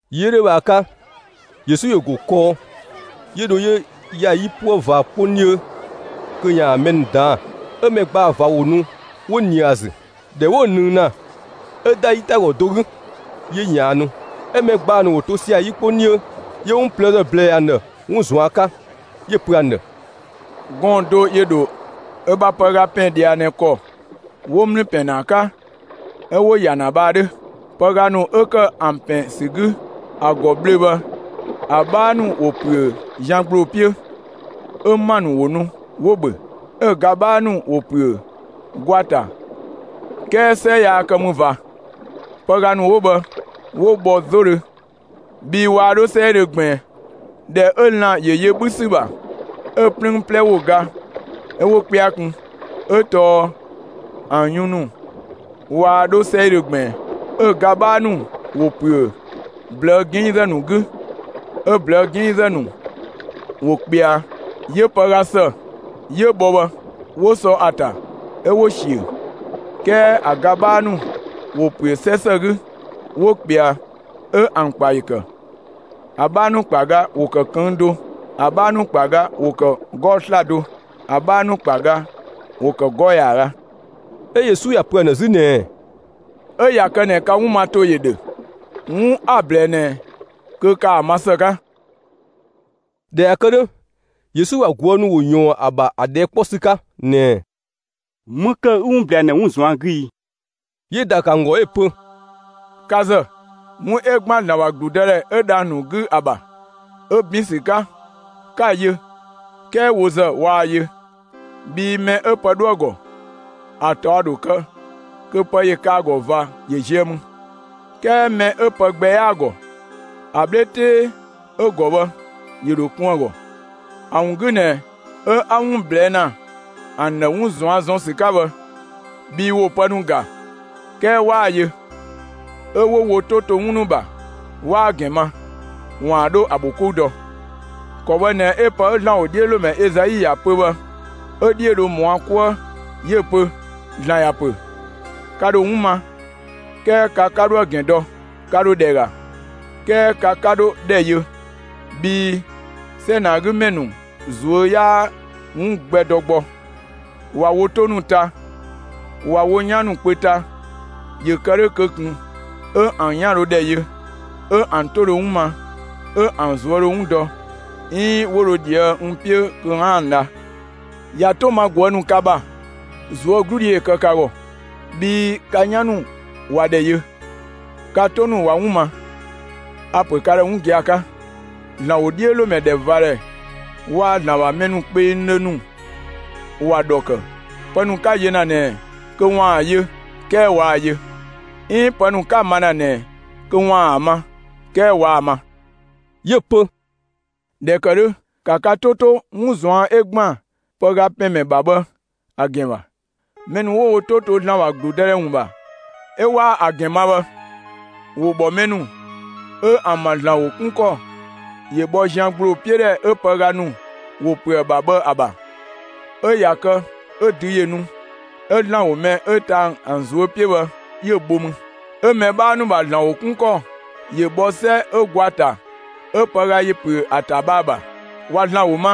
Yi 'ö 'dhö bhë ‑a 'ka, Yesu ‑yö ‑go kɔɔ, 'yö dho, 'yö ‑ya 'yipuë ꞊va 'kpong 'dhiö kö ‑yaan mɛ ‑nu ꞊daan'‑. 'ö mɛ ‑gbaa ꞊va ‑wo nu 'wo ꞊nië ‑a ‑zü. ꞊Dhɛ 'wo‑ ꞊nëng ‑na, 'ö ‑da 'yitagɔ do 'gü, 'yö ꞊yaannu. 'Ö mɛ ‑gbaa ‑nu ‑wo to sia‑ 'yi 'kpong 'dhiö. 'Yö 'wun ꞊plëëzë ꞊blɛɛ ‑an ‑dhë 'wun ꞊zuan' 'ka, 'yö‑ pö ‑an ‑dhë: «Gɔɔn‑ do ‑yö ‑dho ö bha pëga ‑pɛn ꞊dhia ꞊nɛ ‑kɔ 'wo ‑mlü ‑pɛn ‑na ‑a 'ka, 'ö 'wo‑ ‑ya ‑na bhë ‑a 'dhö. Pëga ‑nu 'ö kë ‑an ‑pɛn ‑sü 'gü ö ‑gɔ ꞊bhlöö‑ bhë, ‑a 'bhaa ‑nu ‑wo ‑püö zian ‑gbloo 'piö. 'Ö ‑ma ‑nu ‑wo nu 'wo‑ ‑bhö. 'Ö‑ ga 'bhaa ‑nu ‑wo ‑püö gwa ‑ta; 'kɛɛ 'sɛ 'yaa kë mü ꞊va. Pëga ‑nu 'wo bhë 'wo bhɔ 'zodhö, bhii waa 'dho 'sɛidhö ꞊gbiin. ꞊Dhɛ 'ö lan‑ ‑yö yö 'bhü ‑sü ‑bha, 'ö‑ 'plüün 'plɛ ‑wo ga 'ö 'wo 'kpɛa kun, 'ö tɔɔ ‑an yun ‑nu waa 'dho 'sɛidhö ꞊gbiin. 'Ö‑ ga 'bhaa ‑nu ‑wo ‑püö ꞊blëë' 'ginngzë ‑nu 'gü, 'ö ꞊blëë' 'ginngzë ‑nu ‑yö ꞊kpɛa, 'yö pëga ‑së 'yö bhɔ bhë 'wo sɔ ‑a ‑ta, 'ö 'wo‑ ꞊siö. 'Kɛɛ ‑a ga 'bhaa ‑nu ‑wo ‑püö 'sɛ ‑së 'gü, 'wo ꞊kpɛa, 'ö ‑an ‑kpa ‑yö ‑kë. ‑A 'bhaa ‑nu ‑kpa ga ‑wo ‑kë ꞊këng' do; ‑a 'bhaa ‑nu ‑kpa ga ‑wo ‑kë 'gɔɔ‑ 'slado, 'ö‑ 'bhaa ‑nu ‑kpa ga ‑wo ‑kë 'gɔɔ‑ ‑yaaga.» 'Ö Yesu ‑ya pö ‑an ‑dhë 'zü ꞊nɛɛ: «'Ö ꞊ya kë ꞊nɛ ka 'wun ma ‑to ‑yö ‑dhö, 'wun 'a‑ ꞊blɛɛ ꞊nɛ kö ‑ka ‑a ma ‑së 'ka!» ꞊Dhɛ ꞊ya kë 'dhö, Yesu ‑bha ꞊guë' ‑nu ‑wo ‑yɔɔn ‑a ‑bha ‑a ꞊dhɛɛ' 'kpɔ ‑sü 'ka ꞊nɛɛ: «‑Më ‑kë 'ü 'wun ꞊blɛɛ ‑an ‑dhë 'wun ꞊zuan' 'gü i?» 'Yö‑ ‑daa ‑kë ‑an ‑gɔ 'ö‑ pö: «Ka ‑zë, 'wun 'ö ‑gban ‑Zlan ‑bha ‑gludëdhɛ 'ö dhang‑ ‑nu 'gü ‑a ‑bha 'ö 'bin ‑sü 'ka, 'ka‑ yö; 'kɛɛ wo ‑zë, waa‑ yö. Bhii mɛ 'ö pë 'dhö ‑a ‑gɔ, ‑a ꞊taɔ' ‑dho kë, kö pë ‑yö kë ‑a ‑gɔ ꞊va ‑yö ziö ‑mü. 'Kɛɛ mɛ 'ö pë gbɛ 'yaa‑ ‑gɔ, ‑a 'bhle 'tee 'ö‑ ‑gɔ bhë ‑yö ‑dho kun ‑a ‑gɔ. ‑A ‑wun 'gü ꞊nɛ 'ö 'a 'wun ꞊blɛɛ' ‑na ‑an ‑dhë 'wun ꞊zuan' ‑zɔn ‑sü 'ka bhë; bhii ‑wo pë ‑nu ‑ga, 'kɛɛ 'waa‑ yö; 'ö 'wo wo 'to to 'wun ‑nu ‑bha, 'waa‑ ‑gɛn ma, ‑waan 'dho ‑a ‑bho 'kou dɔ. ‑Kɔ bhë ꞊nɛ 'ö pë 'ö ‑Zlan ‑wodhiölomɛ Ezai ‑ya pö bhë 'ö‑ 'dhiö dho ‑mɔ ‑a 'ka 'kuë; 'yö‑ pö: ‑Zlan ‑ya pö: Ka ‑dho 'wun ma, 'kɛɛ ka 'ka 'dho ‑a ‑gɛn dɔ; ka ‑dho ‑dhɛ ‑ga, 'kɛɛ ka 'ka 'dhodhɛ yö. Bhii 'sɛ ꞊nɛ ‑a 'gü ‑mɛ ‑nu ꞊zuö' 'yaa 'wun gbɛ dɔ gbɔ. ꞊Wa wo 'to ‑nu ‑ta, ꞊wa wo 'yan ‑nu kpö ‑ta, ‑yö ‑kë 'dhö kö ꞊kun 'ö ‑an 'yan dho ‑dhɛ yö, 'ö ‑an 'to dho 'wun ma, 'ö ‑an ꞊zuö' dho 'wun dɔ, 'iin 'wo dho ꞊dhië' n 'piö kö 'aan‑ dha. ꞊Ya 'to ma ꞊guë' ‑nu ka ‑bha, ꞊zuögludhi ‑yö kë ka ‑gɔ. Bhii ka 'yan ‑nu ꞊wa ‑dhɛ yö, ka 'to ‑nu ꞊wa 'wun ma. A‑ ‑pö ka ‑dhë 'wun gia‑ 'ka: ‑Zlan ‑wodhiölomɛ ‑dhɛvadhɛ waa‑ ‑Zlan ‑bha mɛ kpengdhö ‑nu ‑wa ‑dhɔ ‑kë, pë ‑nu 'ka‑ yö ‑na ꞊nɛ kö ‑waan ‑a yö, 'kɛɛ waa‑ yö. 'Iin pë ‑nu 'ka‑ ma ‑na ꞊nɛ kö ‑waan ‑a ma, 'kɛɛ waa‑ ma.» 'Yö‑ pö: «꞊Dhɛ ‑kë 'dhö ‑ka ka 'to 'to, 'wun ꞊zuan' 'ö ‑gban pëga ‑pɛn ‑mɛ ‑bha bhë ‑a ‑gɛn ‑bha! Mɛ ‑nu 'wo wo 'to to ‑Zlan ‑bha ‑gludëdhɛ ‑wun ‑bha 'ö 'waa ‑a ‑gɛn ma bhë, ‑wo ‑bhɔ mɛ ‑nu 'ö ‑an ‑bha ‑Zlan ‑wo 'kun ‑kɔ ‑yö ‑bhɔ zian ‑gbloo 'piö ‑dhɛ 'ö pëga ‑nu ‑wo ‑püö ‑a ‑bha bhë ‑a ‑bha. 'Ö ꞊ya kë 'ö dü ‑yö nu, 'ö ‑Zlan ‑wo mɛ 'ö ta ‑an ꞊zuö' 'piö bhë 'yö‑ bho mü. 'Ö mɛ 'bhaa ‑nu ‑bha ‑Zlan ‑wo 'kun ‑kɔ ‑yö bhɔ 'sɛ 'ö gwa ‑ta 'ö pëga ‑yö ‑püö ‑a ‑ta bhë ‑a ‑bha. ꞊Wa ‑Zlan ‑wo ma,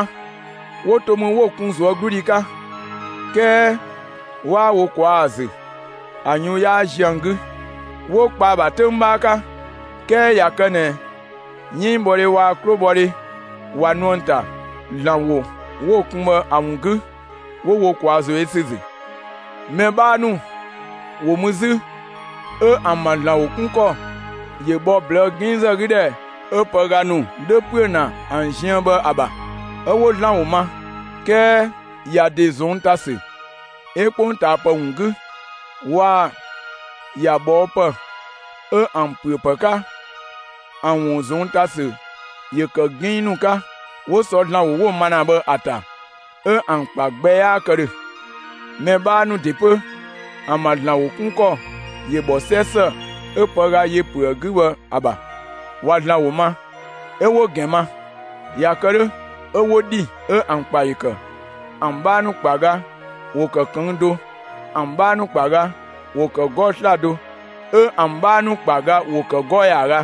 'wo to mü 'ö‑ kun ꞊zuögludhi 'ka, 'kɛɛ 'waa wo ꞊kwaa' ‑a ‑zü, ‑a yun 'yaa ziö ‑an 'gü, 'wo kpa ‑a ‑bha 'töng 'bhaa 'ka, 'kɛɛ ꞊ya kë ꞊nɛ 'yënngbhɔdhe waa‑ 'klobhɔdhe ꞊wa nu ‑an ‑ta, ‑Zlan ‑wo 'wo‑ kun bhë ‑a ‑wun 'gü, 'wo wo ꞊kwaa ‑zo yö ‑sü ‑zü. Mɛ 'bhaa ‑nu ‑wo mü 'zü, 'ö ‑an ‑bha ‑Zlan ‑wo 'kun ‑kɔ ‑yö ‑bhɔ ꞊blëë' 'ginngzë 'gü ‑dhɛ 'ö pëga ‑nu 'dhö ‑püö ‑na ‑an ziën bhë ‑a ‑bha. 'Ö 'wo ‑Zlan ‑wo ma, 'kɛɛ ‑ya ‑de ꞊zɔnng' ‑ta ‑sü 'ö 'kpongtaapë ‑wun 'gü waa‑ ‑ya ꞊bhɔɔpë 'ö ‑an ‑püö ‑pë 'ka, ‑an ‑wun ꞊zɔnng' ‑ta ‑sü ‑yö ‑kë 'ginng ‑nu 'ka; 'wo sɔ ‑Zlan ‑wo 'ö 'wo‑ ma ‑na bhë ‑a ‑ta, 'ö ‑an ‑kpa gbɛ 'yaa kë ‑dhö. Mɛ 'bhaa ‑nu ‑de 'pö ‑an ‑bha ‑Zlan ‑wo 'kun ‑kɔ ‑yö bhɔ 'sɛ ‑së 'ö pëga ‑yö ‑püö ‑a 'gü bhë ‑a ‑bha: ꞊Wa ‑Zlan ‑wo ma, 'ö 'wo‑ ‑gɛn ma. ꞊Ya kë 'dhö, 'ö 'wo ‑dhi, 'ö ‑an ‑kpa ‑yö ‑kë. ‑An 'bhaa ‑nu ‑kpa ga ‑wo ‑kë ꞊këng' do, ‑an 'bhaa ‑nu ‑kpa ga ‑wo ‑kë 'gɔɔ‑ 'slado, 'ö ‑an 'bhaa ‑nu ‑kpa ga ‑wo ‑kë 'gɔɔ‑ ‑yaaga.»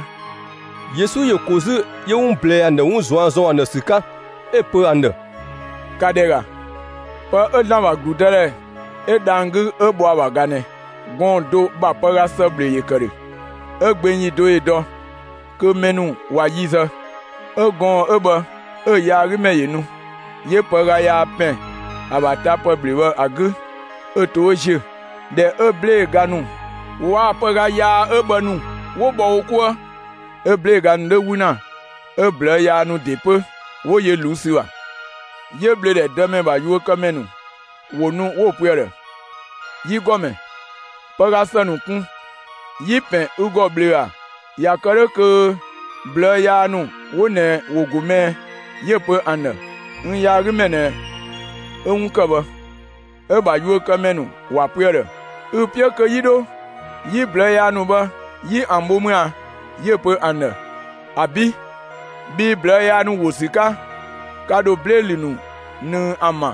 Yesu ‑yö ‑ko 'zü 'yö 'wun ꞊blɛɛ ‑an ‑dhë 'wun ꞊zuan' ‑zɔn ‑sü 'ka, 'ö‑ pö ‑an ‑dhë: «‑Ka ‑dhɛ ‑ga, pë 'ö ‑Zlan ‑bha ‑gludëdhɛ 'ö dhang‑ 'gü 'ö bhɔ ‑a ‑bha ꞊ga ꞊nɛ: Gɔɔn‑ do ‑bha pëga ‑së ‑bhlö ‑yö ‑kë ‑dhö. 'Ö gbeng ‑yi do ‑yö dɔ, kö mɛ ‑nu ꞊wa yi zë, 'ö gɔɔn‑ 'ö bhë 'ö‑ yaagümɛ ‑yö nu, 'yö pëga yaa ‑pɛn ‑a ‑bha tapë ‑bhlö bhë ‑a 'gü 'ö to 'ö ‑ziö. ꞊Dhɛ 'ö 'blee‑ ga ‑nu waa‑ pëga yaa 'ö bhë ‑nu 'wo bhɔ wo 'kuë‑, 'ö 'blee‑ ga ‑nu 'dho 'wü ‑na 'ö ꞊blëë' yaa ‑nu ‑de 'pö 'wo yö ꞊luu' ‑sü ‑bha. 'Yö ꞊bhlöödhɛ dëmɛ ‑bha yuökëmɛ ‑nu ‑wo nu 'wo‑ pö ‑a ‑dhë: ‹Yi ‑Gɔmɛ, pëga ‑së ‑nu kun yi‑ ‑pɛn ü ‑gɔ ꞊bhlöö‑ ‑a, ꞊ya kë 'dhö kö ꞊blëë' yaa ‑nu 'wo ꞊nɛ ‑wo ‑go më ꞊ɛ?› 'Yö‑ pö ‑an ‑dhë: ‹N yaagümɛ ꞊nɛ 'ö‑ 'wun ‑kë bhë!› 'Ö‑ ‑bha yuökëmɛ ‑nu ‑wa pö ‑a ‑dhë: ‹Ü‑ 'piö kö 'yi 'dho 'yi ꞊blëë' yaa ‑nu bhë 'yi ‑an bho mü ꞊a?› 'Yö‑ pö ‑an ‑dhë: ‹‑Abi', bhii ꞊blëë' yaa ‑nu ‑wo ‑sü 'ka, ka ‑dho 'blee‑ 'lü ‑nu ꞊nëng ‑an ‑bha,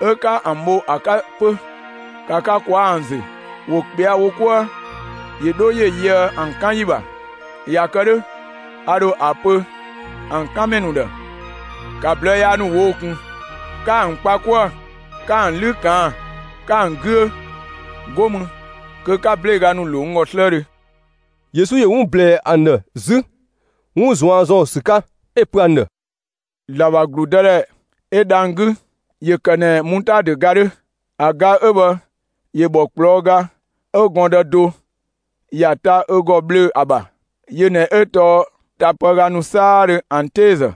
'ö 'ka ‑an bho ‑a 'ka 'pö. ‑Ka ka ꞊kwaa' ‑an ‑zü, ‑wo ꞊kpɛa' wo 'kuë, ‑yö 'dho ‑yö yöë ‑an 'kan ‑yi ‑bha! ꞊Ya kë 'dhö, a ‑dho ‑a pö ‑an 'kan ‑mɛ ‑nu ‑dhë: ‑Ka ꞊blëë' yaa ‑nu ꞊woo'‑ ꞊kun, 'ka ‑an kpa 'kuë‑ 'ka ‑an 'lü ꞊kaan'‑, 'ka ‑an 'güö! 'Go mü kö 'ka 'blee‑ ga ‑nu ‑lo n ‑gɔ 'slëëdhö!›» Yesu ‑yö 'wun ꞊blɛɛ ‑an ‑dhë 'zü 'wun ꞊zuan' ‑zɔn ‑sü 'ka, 'ö‑ pö ‑an ‑dhë: «‑Zlan ‑bha ‑gludëdhɛ 'ö dhang‑ 'gü ‑yö ‑kë ꞊nɛ mutaadö ga 'dhö. ‑A ga 'ö bhë ‑yö ‑bhɔ ꞊kplɔɔ' ga 'ö gɔɔndë do ‑ya ta ö ‑gɔ ꞊bhlöö‑ ‑a ‑bha. Yö ꞊nɛ 'ö tɔɔ tapëga ‑nu 'saadhö ‑an 'teezë,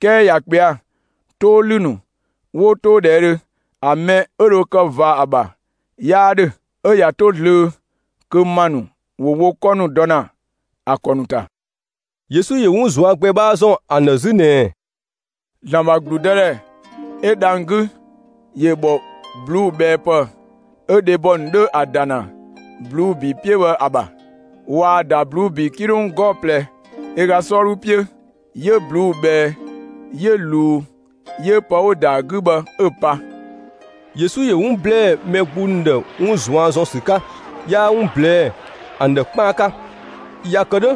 'kɛɛ ꞊ya ꞊kpɛa'‑, 'too ‑lü ‑nu 'wo 'toodhɛɛdhö, ‑a mɛ 'ö dho kë ꞊va ‑a ‑bha 'yaa 'dhö; 'ö ꞊ya 'to zlöö kö ‑ma ‑nu ‑wo wo 'kɔ ‑nu dɔ ‑na ‑a ‑kɔ ‑nu ‑ta.» Yesu ‑yö 'wun ꞊zuan' gbɛ 'bhaa ‑zɔn ‑an ‑dhë 'zü ꞊nɛɛ: «‑Zlan ‑bha ‑gludëdhɛ 'ö dhang‑ 'gü ‑yö ‑bhɔ ꞊bluubhɛɛpë 'ö dhebɔ ‑nu 'dho ‑a ‑da ‑na ꞊bluu'‑ ‑bi 'piö bhë ‑a ‑bha. ꞊Waa‑ ‑da ꞊bluu'‑ ‑bi 'kilong 'gɔɔ‑ ꞊plɛ ö ga 'sɔɔdhu 'piö, 'yö ꞊bluu'‑ ꞊bhɛɛ 'yö ꞊luu 'yö pë 'wo‑ ‑da ‑a 'gü bhë 'ö‑ pa.» Yesu ‑yö 'wun ‑blɛɛ mɛ gbung ‑nu ‑dhë 'wun ꞊zuan' ‑zɔn ‑sü 'ka; 'yaa 'wun ꞊blɛɛ'‑ ‑an ‑dhë 'kpaan 'ka. ‑Ya kë 'dhö,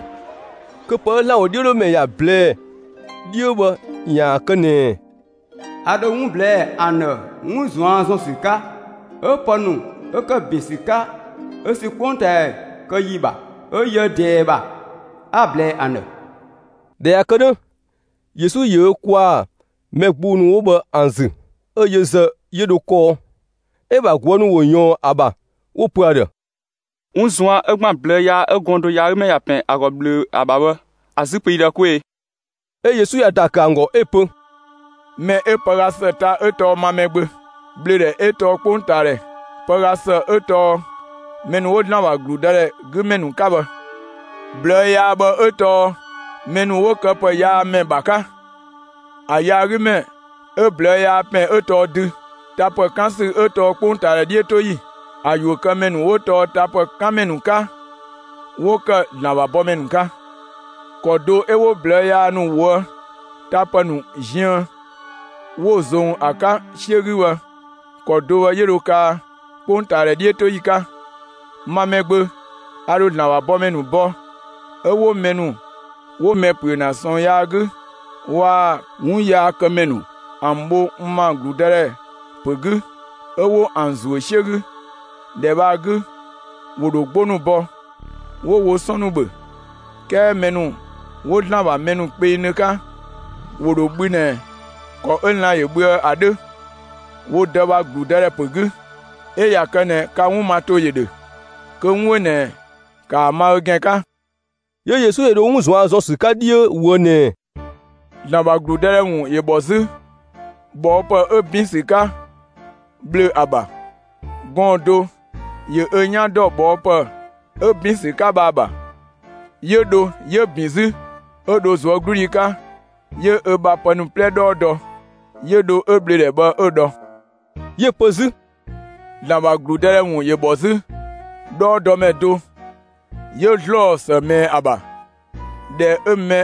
kö pë 'ö ‑Zlan ‑wodhiölomɛ ‑ya ꞊blɛɛ 'dhiö bhë ‑yaan kë ꞊nɛɛ: A ‑dho 'wun ꞊blɛɛ'‑ ‑an ‑dhë 'wun ꞊zuan' ‑zɔn ‑sü 'ka, 'ö pë ‑nu 'wo ‑kë ‑bin ‑sü 'ka 'ö ‑sü 'kpongtaadhɛ kë yi ‑bha 'ö yöë ꞊dɛɛ ‑bha, 'a‑ ꞊blɛɛ ‑an ‑dhë. ꞊Dhɛ ꞊ya kë 'dhö, Yesu ‑yö ö ‑kwaa mɛ gbung ‑nu 'wo bhë ‑an ‑zü, 'ö yö ‑zë 'yö dho kɔɔ. 'Ö‑ ‑bha ꞊guë' ‑nu ‑wo ꞊yɔɔn ‑a ‑bha 'wo‑ pö ‑a ‑dhë: «'Wun ꞊zuan' 'ö ‑gban ꞊blëë' yaa 'ö gɔɔn‑ do yaagümɛ ‑ya ‑pɛn ‑a ‑gɔ ꞊bhlöö‑ bhë ‑a ‑bha bhë, ‑a 'zü pö yi ‑dhë 'kwee‑!» 'Ö Yesu ‑ya ‑daa ‑kë ‑an ‑gɔ 'ö‑ pö: «Mɛ 'ö pëga ‑së ta 'ö tɔɔ ma Mɛgbö. ꞊Bhlöödhɛ 'ö tɔɔ 'kpongtaadhɛ, pëga ‑së 'ö tɔɔ mɛ ‑nu 'wo ‑Zlan ‑bha ‑gludëdhɛ 'gü ‑mɛ ‑nu 'ka bhë; ꞊blëë' yaa bhë 'ö tɔɔ mɛ ‑nu 'wo këpëyaamɛ ‑bha 'ka. ‑A yaagümɛ 'ö ꞊blëë' yaa ‑pɛn 'ö tɔɔ dü; tapë 'kan ‑sü 'ö tɔɔ 'kpongtaadhɛ 'dhiötoyi. 'Ö yuökëmɛ ‑nu 'wo tapë 'kan ‑mɛ ‑nu 'ka, 'wo ‑kë ‑Zlan ‑bha bɔmɛ ‑nu 'ka. ‑Kɔ do 'ö 'wo ꞊blëë' yaa ‑nu ꞊woë' tapë ‑nu ziën 'wo‑ ‑zong ‑a 'ka 'siö 'gü bhë, ‑kɔ do bhë 'yö dho kaa 'kpongtaadhɛ 'dhiötoyi 'ka. Ma Mɛgbö, a ‑dho ‑Zlan ‑bha bɔmɛ ‑nu bɔ, 'ö 'wo mɛ ‑nu 'wo mɛ ‑püö ‑na ꞊sɔɔn yaa 'gü waa‑ 'wunyaakëmɛ ‑nu ‑an bho n ‑ma ‑gludëdhɛ ‑pö 'gü, 'ö 'wo ‑an ‑zuö 'siö 'gü. ‑Dhɛ bhë ‑a 'gü, ‑wo ‑dho 'gbo ‑nu bɔ, 'wo wo 'sɔn ‑nu ‑bhö. 'Kɛɛ mɛ ‑nu 'wo ‑Zlan ‑bha mɛ kpengdhö 'ka, ‑wo ‑dho bhü ꞊nɛ ‑kɔ 'ö lan‑ ‑yö bhüë ‑a 'dhö wo Dë ‑bha ‑gludëdhɛ ‑pö 'gü. 'Ö ꞊ya kë ꞊nɛ, ka 'wun ma ‑to ‑yö ‑dhö, kö 'wun 'ö ꞊nɛ ‑kaa ma ö ‑gɛn 'ka!» 'Yö Yesu ‑yö dho 'wun ꞊zuan' ‑zɔn ‑sü 'ka 'dhiö ꞊woë' ꞊nɛɛ: «‑Zlan ‑bha ‑gludëdhɛ ‑wun ‑yö ‑bhɔ 'zü ꞊bhɔɔpë 'ö ‑bin ‑sü 'ka ꞊bhlöö‑ ‑a ‑bha. Gɔɔn‑ do ‑yö ö 'yan dɔ ꞊bhɔɔpë 'ö ‑bin ‑sü 'ka bhë ‑a ‑bha; 'yö dho 'yö‑ ‑bin 'zü. 'Ö dho ꞊zuögludhi 'ka, 'yö ö bha pë ‑nu 'plɛ 'dhɔɔ dɔ, 'yö dho 'ö ꞊bhlöödhɛ bhë 'ö‑ dhɔ.» 'Yö‑ pö 'zü: «‑Zlan ‑bha ‑gludëdhɛ ‑wun ‑yö ‑bhɔ 'zü 'dhɔɔdɔmɛ do 'yö ‑zlɔɔ ‑së ꞊mɛɛ ‑a ‑bha. ꞊Dhɛ 'ö‑ mɛ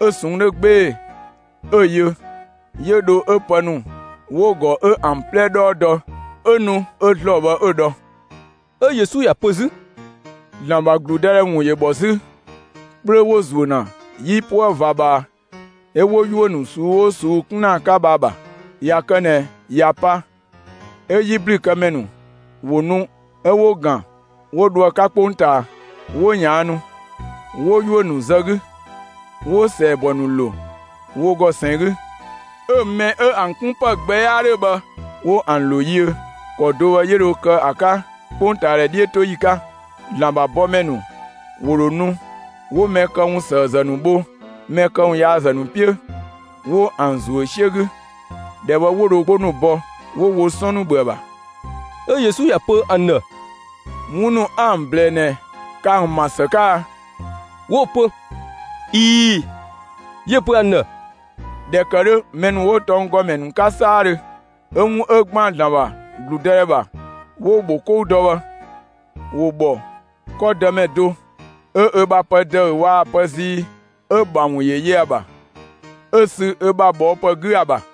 'ö‑ ꞊sɔnng' 'dhö 'gbee‑ 'ö‑ yö, 'yö dho 'ö pë ‑nu 'wo‑ ‑gɔ 'ö ‑an 'plɛ 'dhɔɔ dɔ, 'ö nu 'ö ‑zlɔɔ bhë 'ö‑ dhɔ.» 'Ö Yesu ‑ya pö 'zü: «‑Zlan ‑bha ‑gludëdhɛ ‑wun ‑yö ‑bhɔ 'zü 'kplö 'wo‑ ‑zuö ‑na 'yipuë ꞊va ꞊bhaa, 'ö 'wo 'yuö‑ ꞊suu'‑ 'oo ꞊suu'‑ 'kun ‑na ‑a 'ka bhë ‑a ‑bha. ꞊Ya kë ꞊nɛ ꞊ya pa, 'ö 'yiblükëmɛ ‑nu ‑wo ‑nu 'ö 'wo‑ ‑gan 'wo dho ‑a 'ka 'kpongtaa; 'wo ꞊yaannu, 'wo 'yuö‑ ‑nu zë 'gü; 'wo‑ ‑sɛɛbɔ ‑nu ‑lo wo ‑gɔ ꞊sɛn 'gü. 'Ö‑ mɛ 'ö ‑an 'kun ‑pë gbɛ 'yaa 'dhö bhë 'wo ‑an ‑lo yiö. ‑Kɔ do bhë 'yö dho kë ‑a 'ka 'kpongtaadhɛ 'dhiötoyi 'ka. ‑Zlan ‑bha bɔmɛ ‑nu ‑wo ‑dho nu 'wo mɛ këwunyaazë ‑nu bho mɛ këwunsëëzë ‑nu 'piö, 'wo ‑an ‑zuö 'siö 'gü. ‑Dhɛ bhë 'wo dho 'gbo ‑nu bɔ, 'wo wo 'sɔn ‑nu ‑bhö ‑a ‑bha.» 'Ö Yesu ‑ya pö ‑an ‑dhë: «'Wun ‑nu 'a ‑an ꞊blɛɛ ꞊nɛ, ka ‑an ‑ma ‑së 'ka a?» 'Wo‑ pö: «꞊Ii‑.» 'Yö‑ pö ‑an ‑dhë: «꞊Dhɛ ‑kë 'dhö, mɛ ‑nu 'wo tɔnggɔmɛ ‑nu 'ka 'saadhö, 'ö 'wun 'ö ‑gban ‑Zlan ‑bha ‑gludëdhɛ ‑bha, 'wo‑ ‑bho 'kou dɔ bhë, ‑wo ‑bhɔ 'kɔ dëmɛ do 'ö ö bha pë ‑dëü waa‑ pë zii 'ö‑ ‑bha ‑wun yö ‑a ‑bha, 'ö‑ sü ö bha ꞊bhɔɔpë 'gü ‑a ‑bha.»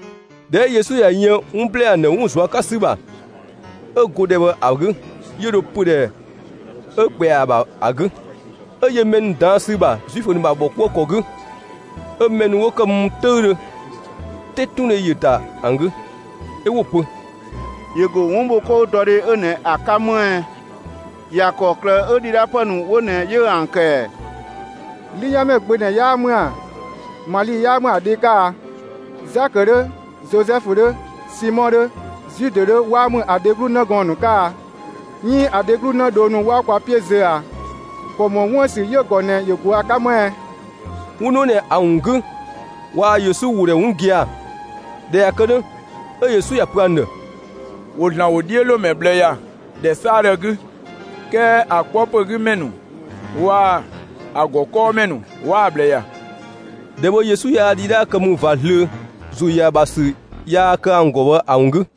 ꞊Dhɛ 'ö Yesu ꞊ya yën 'wun ‑blɛɛ ‑an ‑dhë 'wun ꞊zuan' 'ka ‑sü ‑bha, 'ö go ‑dhɛ bhë ‑a 'gü, 'yö dho pödhɛ 'ö ꞊kpɛa ‑a ‑bha ‑a 'gü, 'ö yö mɛ ‑nu ꞊daan' ‑sü ‑bha Zuifö ‑nu ‑bha ‑bhɔkuëkɔ 'gü. 'Ö mɛ ‑nu 'wo ‑kë mü 'töüdhö, 'tetundhe ‑yö ‑da ‑an 'gü, 'ö 'wo‑ pö: «‑Yö ‑go 'wunbhokoudɔdhe 'ö ꞊nɛ ‑a 'ka më ꞊ɛ? ‑Ya ‑kɔklë 'ö ‑dhidhaapë ‑nu 'wo ꞊nɛ 'yö ‑an ‑kë ‑ɛ? 'Lüyanmɛ gbö ꞊nɛ 'yaa ‑mü ‑a? Mali 'yaa ‑mü ‑a dhe 'ka a? Zakö 'dhö, Zozɛfu 'dhö, Simɔ 'dhö, Zude 'dhö 'waa ‑mü ‑a dheglu 'në gɔɔn‑ ‑nu 'ka a? 'Iin ‑a dheglu 'në dhoo ‑nu 'waa kwa 'piö zö ꞊a? ‑Kɔ ‑mɔ 'wun ‑bha ‑sü 'yö‑ ‑gɔ ꞊nɛ 'yö go ‑a 'ka më ꞊ɛ?» 'Wun ‑nu 'wo ꞊nɛ ‑a ‑wun 'gü waa Yesu ‑wo ‑dhɛ 'wun gia‑. ꞊Dhɛ ꞊ya kë 'dhö, 'ö Yesu ‑ya pö ‑an ‑dhë: «‑Wo ‑Zlan ‑wodhiölomɛ ꞊bhlë ‑ya ‑dhɛ 'saadhö 'gü, 'kɛɛ ‑a 'kpɔ ‑pö 'gü ‑mɛ ‑nu waa‑ ‑a ‑gɔ 'kɔɔmɛ ‑nu 'waa‑ ꞊bhlë ‑ya.» ‑Dhɛ bhë Yesu yaa ‑dhidhaa ‑kë mü ꞊va zlöö, ‑zo ‑yö ‑a ‑bha ‑sü yaa kë ‑an ‑gɔ bhë ‑a ‑wun 'gü.